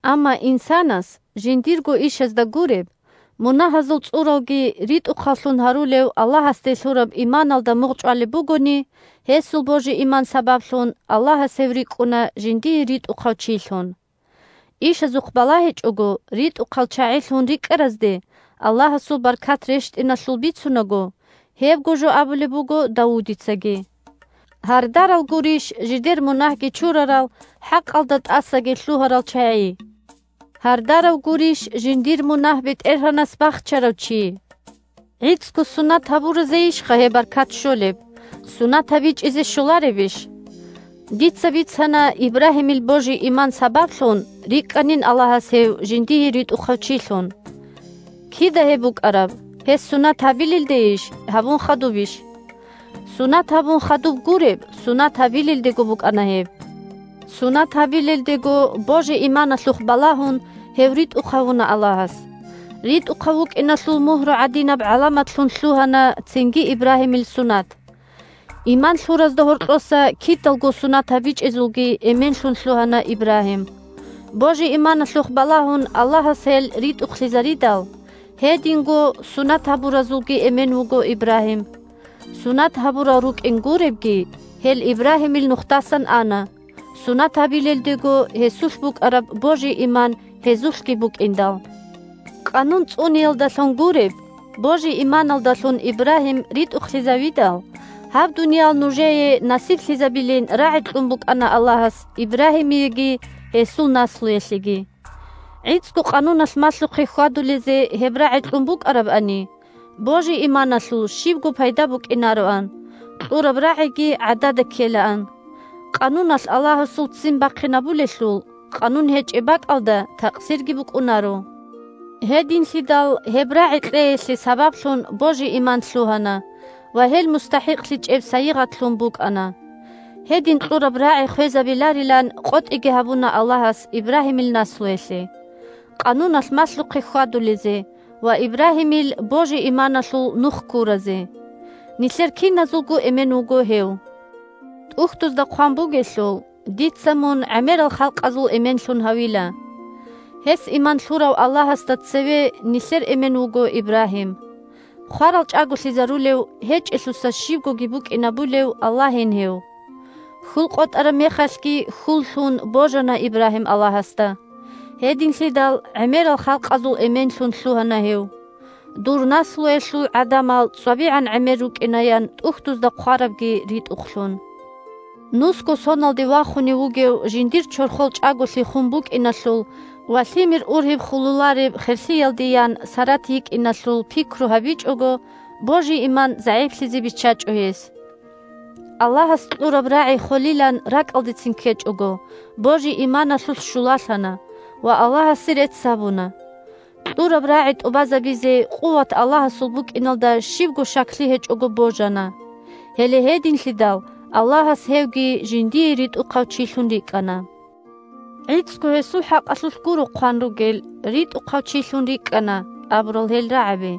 Амма инсанас, жиндирго ишазда гуреб, мунагьазул цӀуралги ритӀухъаллъун гьарулев Аллагьасде лъураб иманалда мугъчӀвалеб бугони, гьесул божи-иман сабаблъун, Аллагьас гьев рикӀкӀуна жиндие ритӀухъав чилъун. Ишазухъ балагьичӀого, ритӀухъал чагӀилъун рикӀкӀаразде Аллагьасул баркат рещтӀиналъул бицунаго, гьебго жо абулеб буго Давудицаги: «Гьардарал гурищ жидер мунагьги чурарал хӀакъалда тӀасаги лъугьарал чагӀи. Гьардарав гурищ жиндир мунагь БетӀергьанас бахчарав чи». ГӀицӀго сунат гьабуразейищха гьеб баркат щолеб, сунат гьабичӀезе щоларебищ? Дица бицана Ибрагьимил божи-иман сабаблъун рикӀкӀанин Аллагьас гьев жиндие ритӀухъав чилъун. Кида гьеб букӀараб – гьес сунат гьабилелдейищ, гьабун хадубищ? Сунат гьабун хадуб гуреб, сунат гьабилелдего букӀана гьеб. Сунат гьабилелдего, божи-иманалъухъ балагьун, гьев ритӀухъ гьавуна Аллагьас. РитӀухъав вукӀиналъул мугьру гӀадинаб гӀаламатлъун лъугьана цинги Ибрагьимил сунат. Иман лъуразда гьоркьоса киналго сунат гьабичӀезулги эменлъун лъугьана Ибрагьим, божи-иманалъухъ балагьун Аллагьас гьел ритӀухълъизаридал. Гьединго сунат гьабуразулги эмен вуго Ибрагьим. Сунат гьабурал рукӀин гуребги, гьел Ибрагьимил нухдасан ана, сунат гьабилелдего гьесулъ букӀараб божи-иман гьезулъги букӀиндал. Къанун цӀуниялдалъун гуреб, божи-иманалдалъун Ибрагьим ритӀухълъизавидал, гьаб дуниял нужее насиблъизабилин рагӀи кьун букӀана Аллагьас Ибрагьимиеги гьесул наслуялъеги. ГӀицӀго Къануналъ малъухъе хьвадулезе гьеб рагӀи кьун букӀарабани, божи-иманалъул щибго пайда букӀинароан, кьураб рагӀиги гӀадада ккелаан, Къануналъ Аллагьасул ццин бахъинабулелъул, Къанун гьечӀеб бакӀалда такъсирги букӀунаро. Гьединлъидал гьеб рагӀи кьеялъе сабаблъун божи-иман лъугьана ва гьел мустахӀикълъичӀеб сайигъатлъун букӀана. Гьедин кьураб рагӀи хвезабиларилан къотӀиги гьабуна Аллагьас Ибрагьимил наслуялъе: Къануналъ малъухъе хьвадулезе ва Ибрагьимил божи-иманалъул нух ккуразе. Нилъер киназулго эмен вуго гьев. ТӀухьдузда хъван бугелъул: «Дица мун гӀемерал халкъазул эменлъун гьавила». Гьес иман лъурав Аллагьасда цеве нилъер эмен вуго Ибрагьим. Хварал чӀаголъизарулев, гьечӀелъуса щибгоги букӀинабулев Аллагьин гьев! Хьул къотӀараб мехалъги хьул лъун божана Ибрагьим Аллагьасда. Гьединлъидал гӀемерал халкъазул эменлъун лъугьана гьев: «Дур наслуялъул гӀадамал цӀвабигӀан гӀемер рукӀина», – ян ТӀухьдузда хъварабги ритӀухълъун. Нусго соналде вахунев вугев жиндир чорхол чӀаголъи хун букӀиналъул ва лъимер ургьиб хулулареб херлъиялде ян Сарат йикӀиналъул пикру гьабичӀого, божи-иман загӀиплъизе биччачӀо гьес. Аллагьас кьураб рагӀи холилан ракӀалдецин ккечӀого, божи-иманалъулъ щулалъана ва Аллагьасе рецц гьабуна. Кьураб рагӀи тӀубазабизе къуват Аллагьасул букӀиналда щибго щаклъи гьечӀого божана. Гьеле гьединлъидал Аллагьас «гьевги жиндие ритӀухъав чилъун рикӀкӀана». ГӀицӀго гьесул хӀакъалъулъ гуро хъван ругел «ритӀухъав чилъун рикӀкӀана» абурал гьел рагӀаби.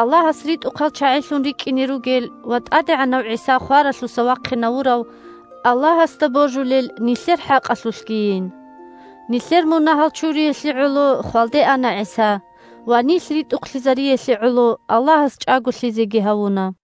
Аллагьас ритӀухъал чагӀилъун рикӀкӀине ругел ва ТӀадегӀанав ГӀиса хваралъуса вахъинавурав Аллагьасда божулел нилъер хӀакъалъулъгийин. Нилъер мунагьал чуриялъе гӀоло хвалде ана ГӀиса ва нилъ ритӀухълъизариялъе гӀоло Аллагьас чӀаголъизеги гьавуна.